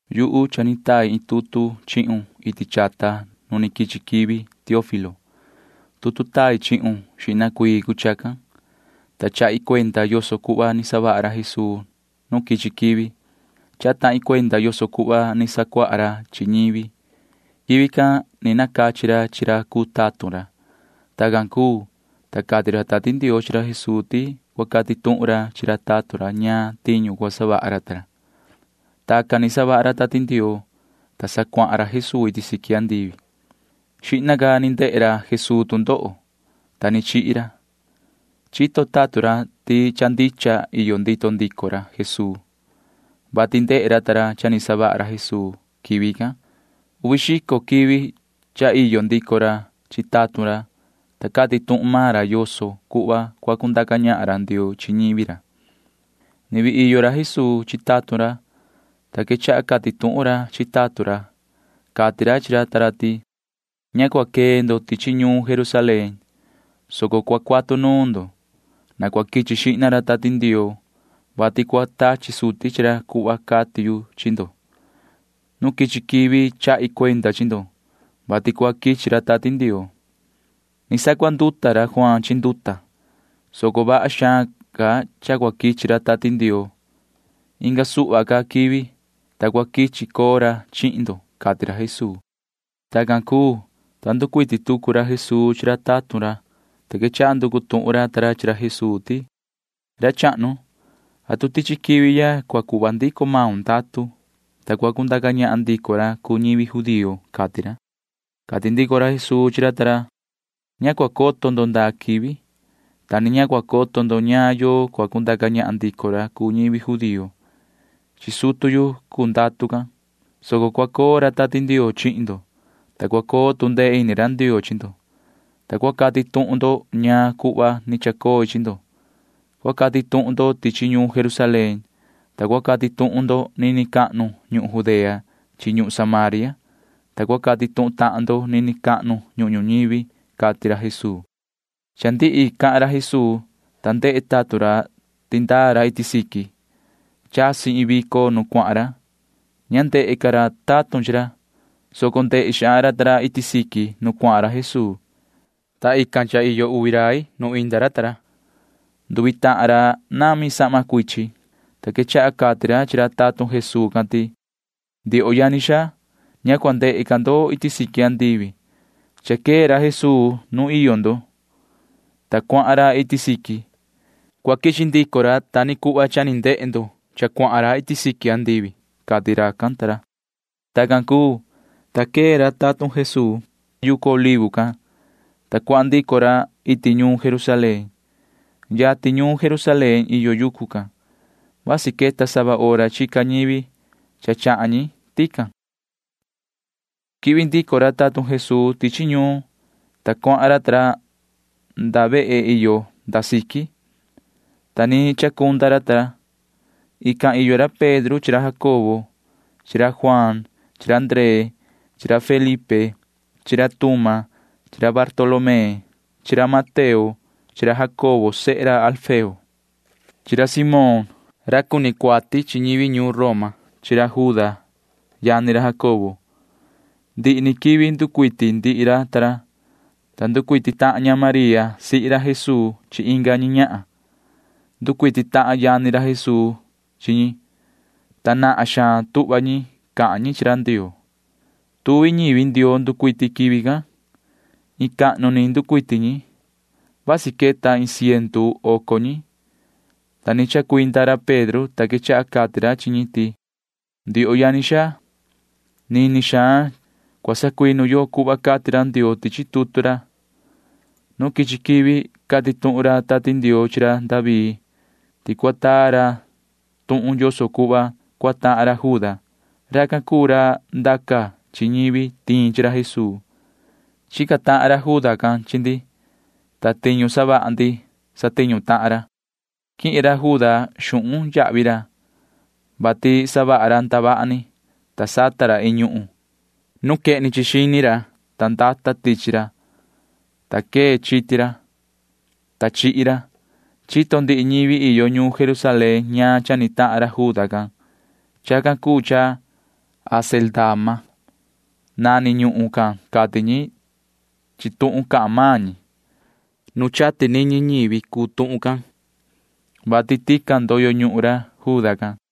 Yuhu cha ni tai iin tutu chihun iti chata nu ni quichi quivi, yoho Teófilo. Tutu tai chihun xihna cuii cuu chacan, ta chahi cuenda yoso cuhva ni savaha ra Jesuu nu quichi quivi. Chaha tahin cuenda yoso cuhva ni sacuaha ra chi ñivi. Quivi can ni nacachi ra chi ra cuu tatun ra. Tacan cuu, ta cati ra Tati Ndioo chi ra Jesuu ti cua cati tuhun ra chi ra tatun ra ñaan tiñu cua savaha ra ta ra. Tacan ni savaha ra Tati Ndioo, ta sa cuahan ra Jesuu iti siqui andivi. Xihna ca ni ndehe ra Jesuu tu ndoho, ta ni chihi ra. Chito tatun ra ti cha ndicha iyo ndito ndico ra Jesuu, vati ndehe ra ta ra cha ni savaha ra Jesuu quivi can. Uvi xico quivi cha iyo ndico ra chi tatun ra, ta cati tuhun maan ra yoso cuhva cua cundaca ñahan ra Ndioo chi ñivi ra. Ni vii iyo ra Jesuu chi tatun ra, ta quechaha cati tuhun ra chi ra ta ra. Cati ra chi ra ta ra ti: ―Ña cua quee ndo tichi ñuun Jerusalén, soco cua cuatu nuun ndo. Na cua quichi xihna ra Tati Ndioo, vati cua tachi suti chi ra cuhva cati yu chi ndo. Nu quichi quivi chahi cuenda chi ndo, vati cua quichi ra Tati Ndioo. Ni sacuanduta ra Juaan chi nduta, soco vaha xaan ca cha cua quichi ra Tati Ndioo. Inga suhva ca quivi, ta cua quichi coo ra chihin ndo ―cati ra Jesuu. Tacan cuu, ta nducuiti tucu ra Jesuu chi ra tatun ra, ta quechaha nducu tuhun ra ta ra chi ra Jesuu ti: ―Ra chahnu, ¿atu tichi quivi ya cua cuhva ndico maun ndatu, ta cua cundaca ñahan ndico ra cuu ñivi judío? ―cati ra. Cati ndico ra Jesuu chi ra ta ra: ―Ña cua coto ndo ndaa quivi, ta ni ña cua coto ndo ñaan yoo cua cundaca ñahan ndico ra cuu ñivi judío. Chi sutu yu cuu ndatu can, soco cua coo ra Tati Ndioo chihin ndo, ta cua coo tu ndee ini ra Ndioo chi ndo, ta cua cati tuhun ndo ñaan cuhva ni chacoi chi ndo. Cua cati tuhun ndo tichi ñuun Jerusalén, ta cua cati tuhun ndo nini cahnu ñuhun Judea chi ñuhun Samaria, ta cua cati tuhun tahan ndo nini cahnu ñuhun ñuñivi ―cati ra Jesuu. Cha ndihi cahan ra Jesuu, ta ndehe tatun ra ti ndaa ra iti siqui. Chasi iin vico nu cuahan ra. Ña ndehe ca ra tatun chi ra, soco ndehe xaan ra ta ra iti siqui nu cuahan Jesuu, ta jihna cha iyo uvi rai nu inda ra ta ra. Nduvi tahan ra nami sahma cuichin, ta quechaha cati ra chi ra tatun Jesuu can ti: ―Ndioho yani xaa, ña cua ndehe ca ndo iti siqui andivi. Cha quee ra Jesuu nuun iyo ndo, ta cuahan ra iti siqui. Cua quichi ndico ra ta ni cuhva ni ndehe ndo cha cuahan ra iti siqui andivi ―cati racan ta ra. Tacan cuu, ta quee ra tatun Jesuu ta ra yucu Olivo can, ta cuahan ndico ra iti ñuun Jerusalén. Yatin ñuun Jerusalén iyo yucu can. [Vasi queta sava hora chica ñivi cha chahan ñi tican.] Quihvi ndico ra tatun Jesuu tichi ñuun, ta cuahan ra ta ra nda vehe iyo nda siqui, ta ni chacunda ra ta ra. Ican iyo ra Pedro chi ra Jacobo chi ra Juaan chi ra Ndree chi ra Felipe chi ra Tuma chi ra Bartolomé chi ra Mateo chi ra Jacobo sehe ra Alfeo chi ra Simón ra cuni cuati chi ñivi ñuun Roma chi ra Juda yani ra Jacobo. Ndihi ni quivi nducuiti ndihi ra ta ra, ta nducuiti tahan ña María sihi ra Jesuu chi inga ñi ñahan. Nducuiti tahan yani ra Jesuu chi ñi, ta nahan xaan tuhva ñi cahan ñi chi ra Ndioo. Tuvi ñivi Ndioo nducuiti quivi can. Iin cahnu ni nducuiti ñi. Vasi queta iin ciendu oco ñi, ta ni chacuinda ra Pedro, ta quechaha cati ra chi ñi ti: ―Ndioho yani xaa, nini xaan cua sacuinu yo cuhva cati ra Ndioo tichi tutu ra. Nu quichi quivi cati tuhun ra Tati Ndioo chi ra David ti cua taa ra tuhun yoso cuhva cua tahan ra Juda. Racan cuu ra ndaca chi ñivi tiin chi ra Jesuu. Chica tahan ra Juda can chi ndi, ta tiñu savaha ndi satiñu tahan ra. Quihin ra Juda xuhun yahvi ra, vati savaha ra ndavaha ni, ta sata ra iin ñuhun. Nduva ra iti xini ra, ta ndata tichi ra, ta quee chiti ra, ta chihi ra. Chito ndihi ñivi iyo ñuun Jerusalén ñaan cha ni tahan ra Juda can. Chacan cuu cha Acéldama nani ñuhun can cati ñi chi tuhun cahan maan ñi. Nu chati niñi ñivi cuu tuhun can, vati tican ndoyo ñuhun ra Juda can.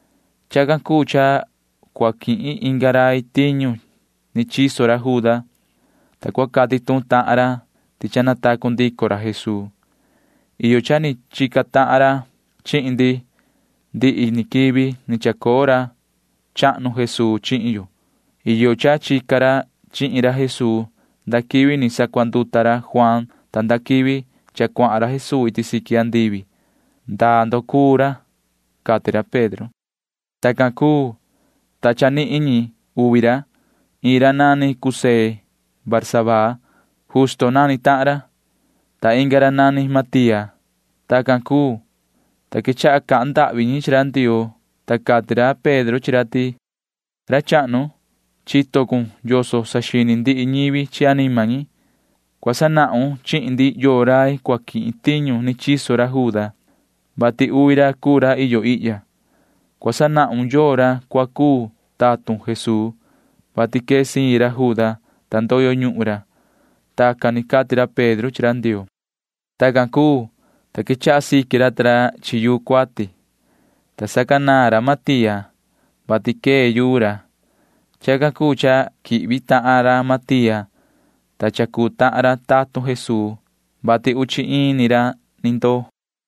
’Chacan cuu cha cua quihin inga rai tiñu ni chiso ra Juda, ta cua cati tuhun tahan ra ti cha natacu ndico ra Jesuu. Iyo cha ni chica tahan ra chihin ndi ndihi ni quivi ni chacoo ra chahnu Jesuu chihin yo. Iyo cha chica ra chihin ra Jesuu nda quivi ni sacuanduta ra Juaan ta nda quivi cha cuahan ra Jesuu iti siqui andivi. ¿Ndaa ndo cuu ra? ―cati ra Pedro. Tacan cuu, ta cha nihin ñi uvi ra. Iin ra nani José Barsabaa. Justo nani tahan ra, ta inga ra nani Matía. Tacan cuu, ta quechaha cahan ndahvi ñi chi ra Ndioo, ta cati ra Pedro chi ra ti: ―Yoho ra chahnu, chito cun yoso saxini ndihi ñivi chi anima ñi. Cua sanahun chihin ndi yoo rai cua quihin tiñu ni chiso ra Juda, vati uvi ra cuu ra iyo ihya. Cua sanahun yoo ra cua cuu tatun Jesuu, vati quee siin ra Juda, ta ndoyo ñuhun ra. Tacan ni cati ra Pedro chi ra Ndioo. Tacan cuu, ta quechaha siqui ra ta ra chi yuu cuati, ta sacanaan ra Matía, vati quee yuu ra. Chacan cuu cha quihvi tahan ra Matía, ta cha cuu tahan ra tatun Jesuu, vati uchi iin ni ra ni ndoo.